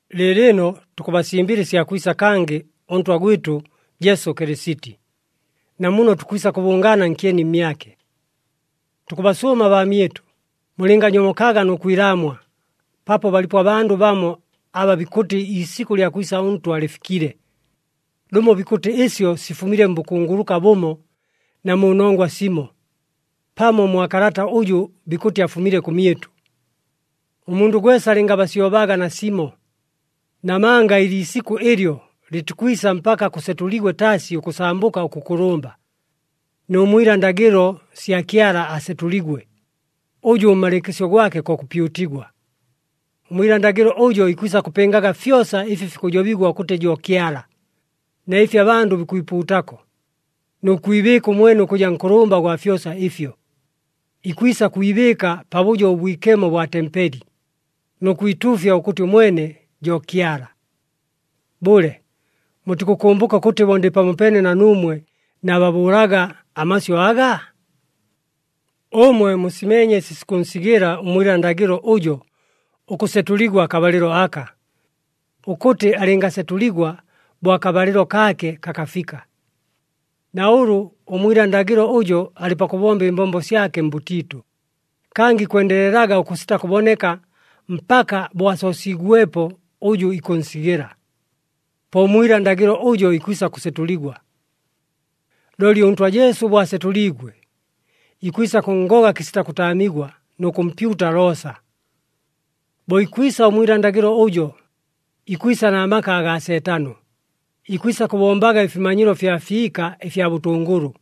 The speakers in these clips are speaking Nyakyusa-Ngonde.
Lɨɨlɨno tukʉbasimbɨla ɨsya kwisa kangɨ ʉNtwa gwɨtʉ Jesu Kɨlɨsiti, na muno tukwisa kʉbʉngaana nkyeni mmyake. Tukʉbasʉʉma baamyɨtʉ, mulɨnganyomokaga nʉ kwilaamwa, paapo balipo abandʉ bamo aba bikʉtɨ iisikʉ lya kwisa ʉNtwa lɨfikile. Lʉmo bikʉtɨ ɨsyo sifumile mbʉkunguluka bʉmo na mu nongwa simo, pamo mwa kalata ʉjʉ bikʉtɨ afumile kʉmyɨtʉ. Ʉmundʉ gwesa alɨngabasyobaga nasimo, namanga ɨliisikʉ ɨlyo lɨtikwisa mpaka kʉsetʉligwe taasi ʉkʉsambʉka ʉkʉkʉlʉmba, nʉ mwila ndagɨlo sya Kyala asetʉligwe, ʉjʉ ʉmmalɨɨkɨsyo gwake ko kʉpyutigwa. Ʉmwila ndagɨlo ʉjo ikwisa kʉpɨngaga fyosa ɨfi fikʉjobigwa ʉkʉtɨ jo Kyala, na ɨfi abandʉ bikwipuutako, nʉ kwibɨɨka ʉmwene ʉkʉja nkʉlʉmba gwa fyosa ɨfyo. Ikwisa kwibɨɨka Pabʉjo ʉBwikemo bwa tempeli, nʉ kwituufya ʉkʉtɨ ʉmwene jo Kyala. Bʉle! Mutikʉkʉmbʉka ʉkʉtɨ bo ndɨ pamopeene na nuumwe naababʉʉlaga amasyʉ aga? Ʉmwe musimeenye ɨsi sikʉnsigɨla ʉmwila ndagɨlo ʉjo ʉkʉsetʉligwa akabalɨlo aka, ʉkʉtɨ alɨngasetʉligwa bo akabalɨlo kaake kakafika. Na ʉlʉ ʉmwila ndagɨlo ʉjo alɨ pakʉbomba ɨmbombo syake mbʉtiitʉ, kangɨ ikwendelelaga ʉkʉsita kʉboneka mpaka bo asoosiigwepo ʉjʉ ikʉnsigɨla. Po ʉmwila ndagɨlo ʉjo ikwisa kʉsetʉligwa. Looli ʉNtwa Jesu bo asetʉliigwe, ikwisa kʉnngoga kɨsita kʉtaamigwa, nʉ kʉmpyuta loosa. Bo ikwisa ʉmwila ndagɨlo ʉjo, ikwisa na maka agaa Seetano, ikwisa kʉbombaga ɨfimanyilo fya fiika ɨfya bʉtʉngʉlʉ,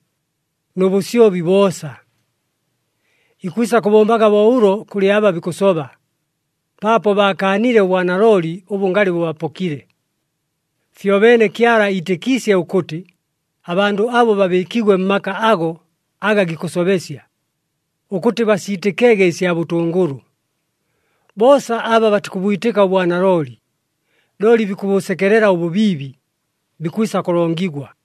nʉ bʉsyobi boosa. Ikwisa kʉbombaga bo ʉlo kʉlɨ aba bikʉsoba, paapo baakaanile ʉbwanalooli ʉbʉ ngalɨ bʉbapokile. Fyobeene Kyala iitɨkiisye ʉkʉtɨ abandʉ abo babɨɨkigwe mmaka ago aga gikʉsobesya, ʉkʉtɨ basiitɨkege ɨsya bʉtʉngʉlʉ. Boosa aba batikʉbwitɨka ʉbwanalooli, looli bikʉbʉsekelela ʉbʉbiibi, bikwisa kʉlongigwa.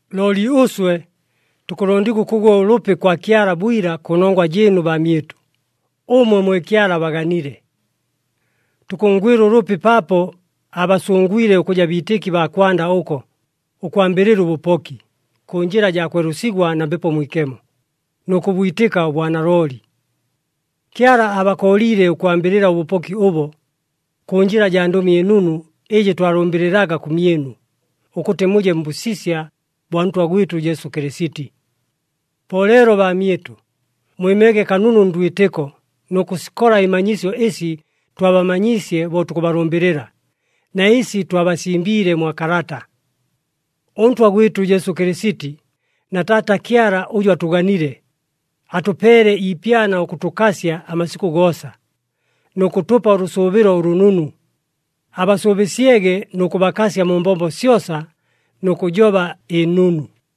Looli ʉswe tukʉlondigwa ʉkʉgwa ʉlʉpi kwa Kyala bwila kʉnongwa jɨɨnu baamyɨtʉ, ʉmwe mwe Kyala abaganile. Tukʉnngwɨla ʉlʉpi paapo aabasʉngwile ʉkʉja biitɨki baa kwanda ʉko, ʉkwambɨlɨla ʉbʉpoki, kʉ njɨla jaa kwelʉsigwa na Mbepo Mwikemo, nʉ kʉbwitɨka ʉbwanalooli. Kyala aabakooliile ʉkwambɨlɨla ʉbʉpoki ʉbo, kʉ njɨla jaa Ndʉmi ɨNunu ɨjɨ twalʉmbɨlɨlaga kʉmyɨnu, ʉkʉtɨ muje mbʉsisya bwa Ntwa gwɨtʉ Jesu Kɨlɨsiti. Po leelo baamyɨtʉ, mwɨmege kanunu ndwitɨko nʉ kʉsikola ɨmanyisyo ɨsi twabamanyiisye bo tukʉbalʉmbɨlɨla, na ɨsi twabasimbiile mwa kalata. ɄNtwa gwɨtʉ Jesu Kɨlɨsiti na Taata Kyala ʉjʉ atʉganile, atʉpeele iipyana ʉkʉtʉkasya amasikʉ goosa, nʉ kʉtʉpa ʉlʉsʉʉbɨlo ʉlʉnunu, abasʉʉbɨsyege nʉ kʉbakasya mu mbombo syosa nʉ kʉjoba ɨnunu.